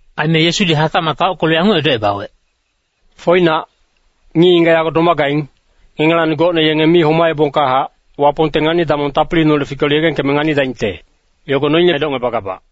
Aime Yesudi hatacmac taockelu yanguc edocebawec, “Foinac, ngic-ngigac yago domagaing, ngengelacni gocne yenge mi homaebongkahac, Wapongte ngani-damong tapiliineholec fikelu yegengkeme nganidaingte, yogo noine edocngebagabac.”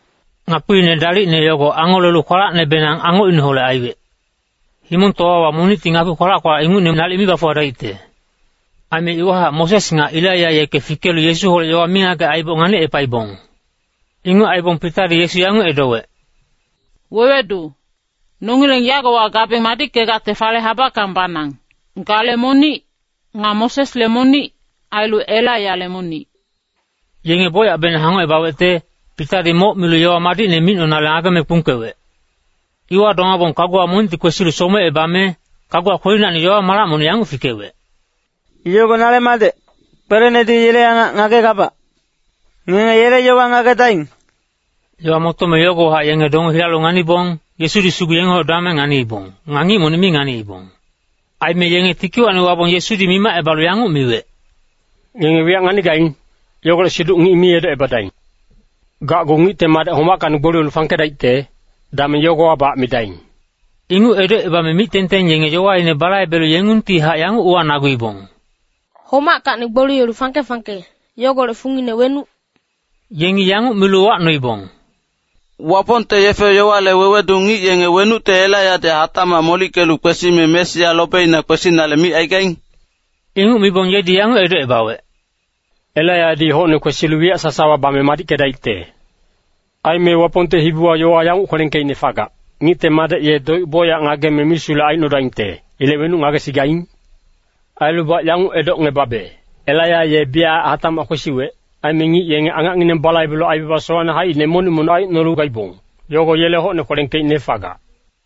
Ngakpiine dalicne yogo angolelu kwalacnebenang angocineholec aiwec. Himongtowawa monicti ngakpi kwalac-kwalac ingucne nalic mi bafuwadaicte. Aime iwahac Moses nga Elaiya yeke fikelu Yesuholec yowa mingagec aiboc nganicepaibong. Inguc aibong Pitadi Yesu yanguc edowec, “Wewedu, nongileng yagowa gabeng madickegacte fale habackang banang. Gale monic, nga Mosesle monic, ailu Elaiyale monic.” Yenge bocyacbenang hangocebawecte, Pitadi moc milu yowa madicne micnonale, ngageme kpungkewec. Iwa domabong kaguwa monicti kwesilu somecebame, kaguwa kwelinacni yowa-malac monic yanguc fikewec, “Yogo nale Madec, kwelenedi yele angac ngagegabac. Ngenge yele yowa ngagedaing!” Yowa motome yogowahac yenge donge hilalu nganibong, Yesudi sugu yengeholec domame nganiibong. Nga ngic monic mi nganiibong. Aime yenge tikiwacni wabong Yesudi mimacebalu yanguc miwec, “Ngenge wiyac nganigaing, yogolec siduc ngic mi edocebadaing. Gacgu Ngicte Madec homackacni gboliyelu fangkedaicte, dameng yogowabac midaing.” Inguc edocebame mic-tengteng yenge yowaine balaibelu yengungtihac yanguc uwanaguibong, “Homackacni gboliyelu fangke-fangke, yogolec fungine wenuc?” Yengi yanguc milu uwacnoibong, “Wapongte yefe-yowale wewedu ngic yenge wenucte Elaiyadi hatacmac molickelu kwesime Mesia lobeina kwesinale micaigaing?” Inguc mibong yedi yanguc edocebawec, “Elaiyadi hocne kwesilu wiyac sasawa bame madickedaicte. Aime Wapongte hibiwa yowa yanguc kwelengkeicne fagac, ‘Ngicte Madec ye doic bocyac ngageme misulec aicnodaingte.’ Ilec wenuc ngagesigaing? Ailubac yanguc edocngebabe, Elaiya ye biyachac hatacmac kwesiwec, aime ngic yenge angacngineng balaibelu aibaba sowacne haicine monic-monic aicnolu gaibong, yogo yele hocne kwelengkeicne fagac.”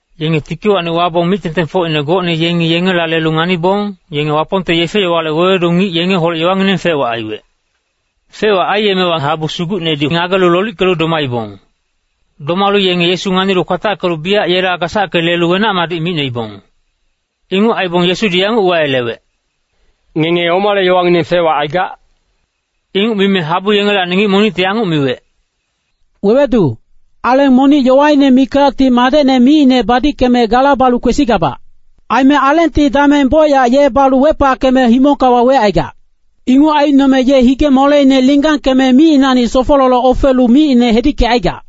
Yenge tikiwacni wabong mic-tengtengfocine gocne yengi yengela lelu nganibong, yenge Wapongte yefe-yowale wewedu ngic yengeholec yowangineng fec-wac aiwec. Fec-wac aiyemewa habu sugucnedi ngagelu lolickelu domaibong. Domalu yenge Yesu nganilu kwatackelu biyac yela gasacke lelu wenac-madic micnoibong. Inguc aibong Yesudi yanguc uwayelewec, “Ngenge omale yowangineng fec-wac aigac?” Inguc mime habu yengelacni ngic monicti yanguc miwec, “Wewedu, aleng monic yowaine mikacti madecne micine badickeme gala balu kwesigabac. Aime alengti dameng bocyac ye balu wepackeme himongka wawecaigac. Inguc aicnome ye hige-moleine linggangkeme micinacni sofololoc ofelu micine hedickecaigac.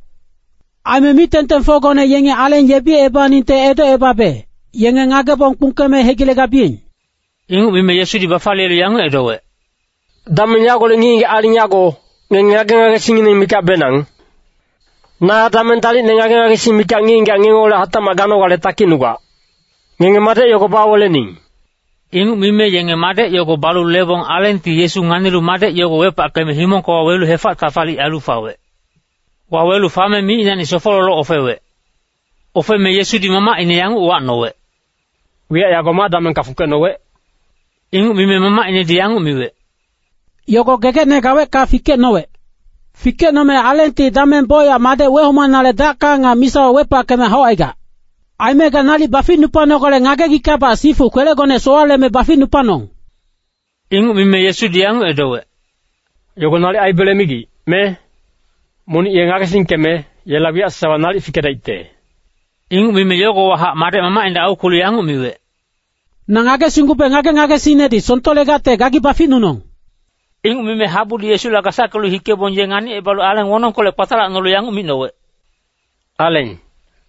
Aime mic-tengtengfocgone yengi aleng yebiyeningte edocebabe, yenge ngagebong kpungkeme hegilegabiyeng.” Inguc mime Yesudi bafaliyelu yanguc edowec, “Dameng yagolec ngic-ngigac aling yago, ngenge ngage-ngagesingngineng mikacbenang. Na dameng dalicne ngage-ngagesing mikac ngic-ngigac ngengeholec hatacmac ganogale takicnugac. Ngenge madec yogo bawelening.” Inguc mime yenge madec yogo balu lebong alengti Yesu nganilu madec yogo wepackeme himongka wawelu hefac-tafalic ailu fawec. Wawelu fame micinacni sofololoc ofewec. Ofeme Yesudi mamacine yanguc uwacnowec, “Wiyac yago ma damengka fungkecnowec?” Inguc mime mamacinedi yanguc miwec, “Yogo gegecne gaweckahac fikecnowec. Fikecnome alengti dameng bocyac madec wehomanale dacka nga misawa wepackeme haucaigac. Aime ga nalic baficnupanogale ngagegickabac sifu kwelegone sowaleme baficnupanong.” Inguc mime Yesudi yanguc edowec, “Yogo nalic aibele migic, me? Monic ye ngagesingkeme, yela wiyac sasawa nalic fikedaicte.” Inguc mime yogowahac madec mamacinedi aukwelu yanguc miwec, “Na ngagesinggube ngage-ngagesingnedi songtolegacte gagi baficnunong.” Inguc mime habudi Yesula gasackelu hikebong ye nganicebalu aleng wonongkolec kpatalacnolu yanguc micnowec, “Aleng,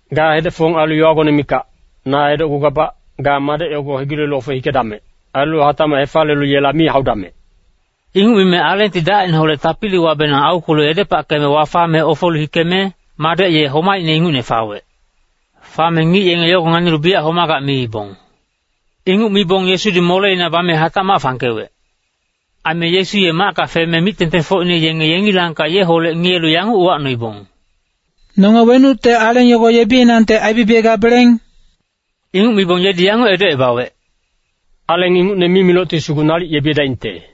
ga hedec-fong ailu yowagone mikac. Na edocgugabac, ga madec yogo hegilelu ofe hikedamec. Ailu hatacmac hefaliyelu yela mi haudamec.” Inguc mime alengti dacineholec tapiliwabenang aukwelu edepackeme wafame ofelu hikeme, madec ye homaicne ingucne fawec. Fame ngic yenge yogo nganilu biyac homagac miibong. Inguc mibong Yesudi moleina bame hatacmac fangkewec. Aime Yesu ye macka feme mic-tengtengfocine yenge yengilangkac yeholec ngiyelu yanguc uwacnoibong, “Nonge wenucte aleng yogo yebiyenangte aibibiyegabeleng?” Inguc mibong yedi yanguc edocebawec, “Aleng ingucne mimilocti sugu nalic yebiyedaingte.”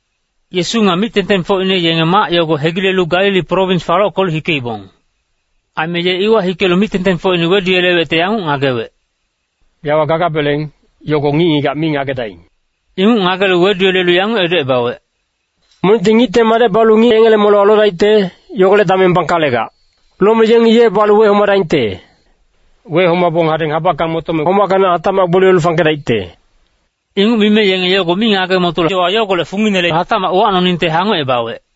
Yesu nga mic-tengtengfocine yenge mac yogo hegilelu Galili prowins falockelu hikeibong. Aime ye iwa hikelu mic-tengtengfocine weduyelewecte yanguc ngagewec, “Yawa gagabeleng, yogo ngic-ngigac mi ngagedaing.” Inguc ngagelu weduyelelu yanguc edocebawec, “Monicti Ngicte Madec balu ngic yengele molewa lodaicte, yogolec dameng bangkalegac. Lome yengi ye balu wehomadaingte. Wehomabong hadeng habackang motome, homackacni hatacmac gboliyelu fangkedaicte.” Inguc mime yenge yogo mi ngage-motolu yowa yogolec funginele hatacmac uwacnoningte hangocebawec.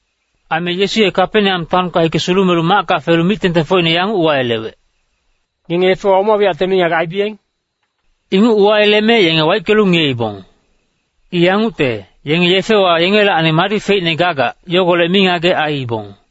Aime Yesu ye Kapeneam taonka hike sulumelu macka felu mic-tengtengfocine yanguc uwayelewec, “Ngenge yefewa oma wiyacte mingagec aibiyeng?” Inguc uwayeleme yenge waickelu ngiyeibong. I yangucte, yenge yefewa yengelacni madi feicne gagac, yogolec mingagec aiibong.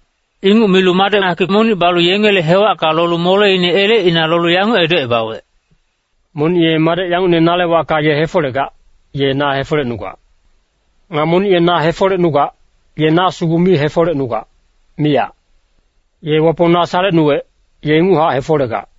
Inguc milu madec hakic monic balu yengele hewacka lolu moleine elecina lolu yanguc edocebawec, “Monic ye madec yangucne nale wacka ye hefolegac, ye na hefolecnugac. Nga monic ye na hefolecnugac, ye na sugu mi hefolecnugac, miyac. Ye Wapong na salecnuwec, ye inguchac hefolegac.”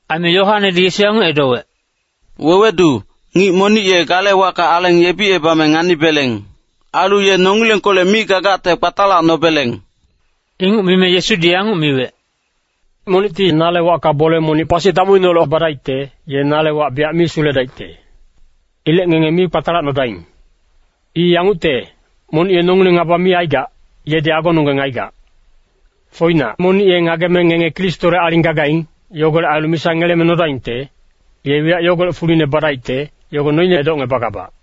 Aime Yoanedi Yesu yanguc edowec, “Wewedu, ngic monic ye gale wacka aleng yebicebame nganibeleng. Ailu ye nongilengkolec mi gagacte kpatalacnobeleng.” Inguc mime Yesudi yanguc miwec, “Monicti nale wacka bole monic pasi damuineholec badaicte, ye nale wac biyac mi suledaicte. Ilec ngenge mi kpatalacnodaing. I yangucte, monic ye nongileng ngaba mi aigac, yedi agononggeng aigac. Foinac, monic ye ngageme ngenge Kristole aling gagaing, yogolec ailu misa ngeleme nodaingte, ye wiyac yogolec fuline badaicte, yogo noine edocngebagabac.”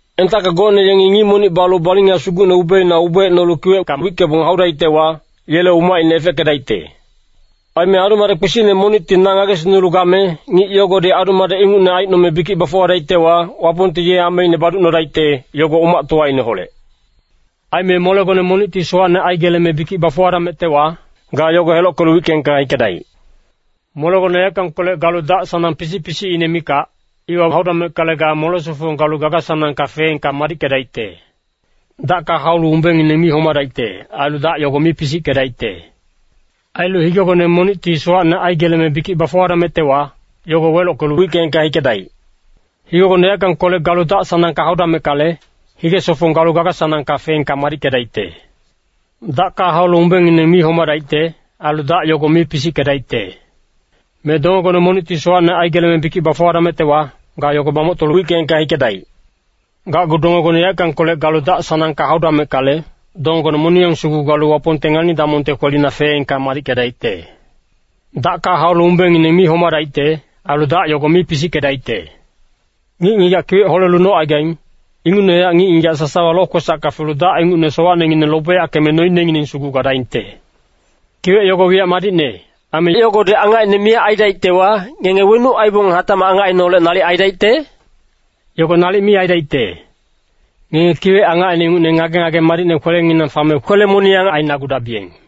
“Entacka gocne yengi ngic monic balu balinga sugucne ubeina ubeecnolu kiwecka wickebong haudaictewa, yele umacine efeckedaicte. Aime adu-madec kpisicne monicti na ngagesingnulu game, ngic yogodi adu-madec ingucne aicnome bikic bafuwadaictewa, Wapongti ye ameine baducnodaicte, yogo umactowaineholec. Aime molegone monicti sowacne aigeleme bikic bafuwadamectewa, ga yogo helockelu wickeengka hikedaic. Molegone yaeckangkolec galu dac-sanang pisic-pisicine mikac, iwa haudameckale, ga mole-sofong galu gaga-sanangka feengka madickedaicte. [‘Dacka haulu umbengngineng mi homadaicte. Ailu dac yogo mi pisickedaicte.’] Ailu higegone monicti sowacne aigeleme bikic bafuwadamectewa, yogo welockelu wickeengka hikedaic. Higegone yaeckangkolec galu dac-sanangka haudameckale, hige-sofong galu gaga-sanangka feengka madickedaicte. [‘Dacka haulu umbengngineng mi homadaicte. Ailu dac yogo mi pisickedaicte.’] Me dongegone monicti sowacne aigeleme bikic bafuwadamectewa, ga yogo bamoctolu wickeengka hikedaic. Gacgu dongegone yaeckangkolec galu dac-sanangka haudameckale, dongegone moniyang sugu galu Wapongte ngani-damongte kwelina feengka madickedaicte. ‘Dacka haulu umbengngineng mi homadaicte. Ailu dac yogo mi pisickedaicte.’ “Ngic-ngigac kiwec holelu nocaigaing, ingucnehac ngic-ngigac sasawa lokwesacka felu dac ingucne sowacnengineng lobeyackeme noinengineng sugu gadaingte. Kiwec yogo wiyac madicne. Aime yogodi angacine miyac aidaictewa, ngenge wenuc aibong hatacmac angacineholec nalic aidaicte? Yogo nalic mi aidaicte. Ngenge kiwec angacine ingucne ngage-ngage madicne kwelenginang fame kwele-moniyang ainagudabiyeng.”